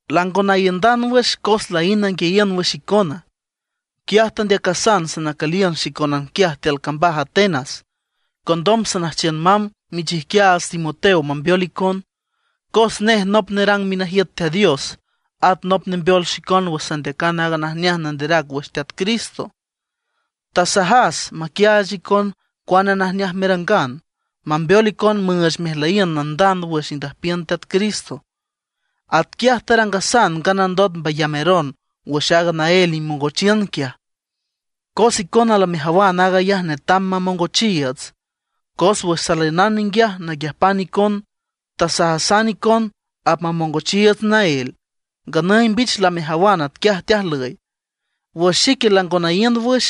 Lango naiündan wüx cos laínd nanguiayiün wüx icona, quiaj tandeacasan sanacüliün xicónan quiaj tiül cambaj Atenas, condom sanüjchiün mamb michijquiaats Timoteo mambeol icon. Cos nej nop nerang minajiüt Teat Dios, at nop nembeol xicon wüx sandeacan aaga najneaj nanderac wüx Teat Cristo. Tasajas maquiaach icon cuane najneaj merangan, mambeol icon müüch mejlüyiün nandand wüx indüjpiün Teat Cristo. Atquiaj tarangasan nganandot mbayameron wüx aaga naél imongochiün quiaj. Cos icona lamejawan aag ayaj netam mamongochiiüts. Cos wüx saliünan ninguiaj naquiüjpan icon tasajasan icon apmamongochiiüts naél. Nganüy mbich lamejawan atquiaj teajlüy. Wüx xique lango naíünd wüx,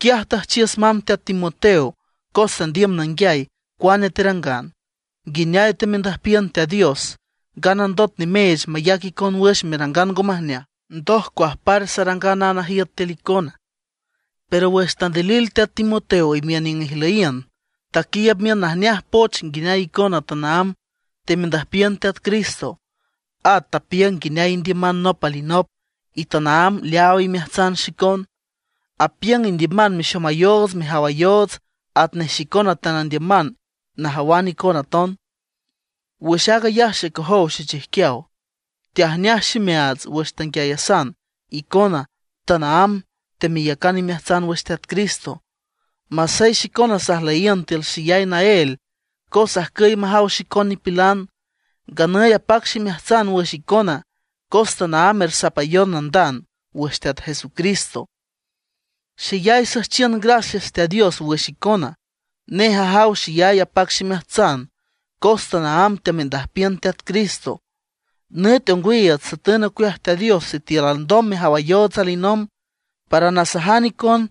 quiaj tüjchiüs mamb teat Timoteo cos sandiüm nanguiay cuane terangan, nguineay temendüjpiün Teat Dios, nganandot nimeech mayac icon wüx merangan ngo majneaj, ndot cuajpar sarangan aaga najiüt tiül icona. Pero wüx tandilil teat Timoteo imiün niüng ijlüyiün, taquiiüb miün najneaj poch nguineay icona tanaámb temendüjpiün Teat Cristo. At tapiüng nguineay indiüman nop alinop, y tanaámb leaaw imeajtsan xicon. Apiüng indiüman mexomayoots mejawayoots atnej xicona teanandiüman najawan icon aton. Wüx aag ayaj xecojow xechijquiaw, tajneaj ximeajtsan wüx tanguiayasan icona tanaámb temeyacan imeajtsan wüx Teat Cristo, masey xicona sajlüyiün tiül xeyay naél cos ajcüy majaw xicon nipilan. Nganüy apac ximeajtsan wüx icona cos tanaámb ersapayon nandand wüx Teat Jesucristo. Xeyay süjchiün gracias Teat Dios wüx icona; nej ajaw xeyay apac ximeajtsan cos tanaámb teamendüjpiün Teat Cristo. Nüt ongwiiüts satüniün ocueaj Teat Dios sitiül alndom mejawayoots alinomb, para nasajan icon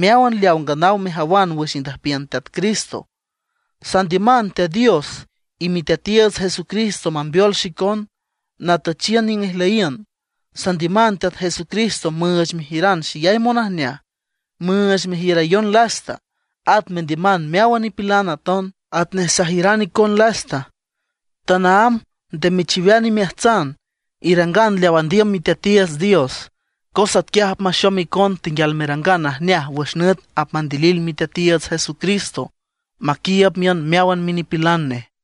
meáwan leaw nganaw mejawan wüx indüjpiün Teat Cristo. Sandiüman Teat Dios y Miteatiiüts Jesucristo mambeol xicon natüchiün niüng ijlüyiün. Sandiüman Teat Jesucristo müüch mejiüran xeyay monajneaj, müüch mejiürayon lasta, at mendiüman meáwan nipilan aton, atnej sajiüran icon lasta. Tanaámb nde mechiwean imeajtsan; irangan leaw andiüm Miteatiiüts Dios, cos atquiaj apmaxom icona tenguial merangan najneaj wüx nüt apmandilil Miteatiiüts Jesucristo maquiiüb miün meáwan minipilan nej.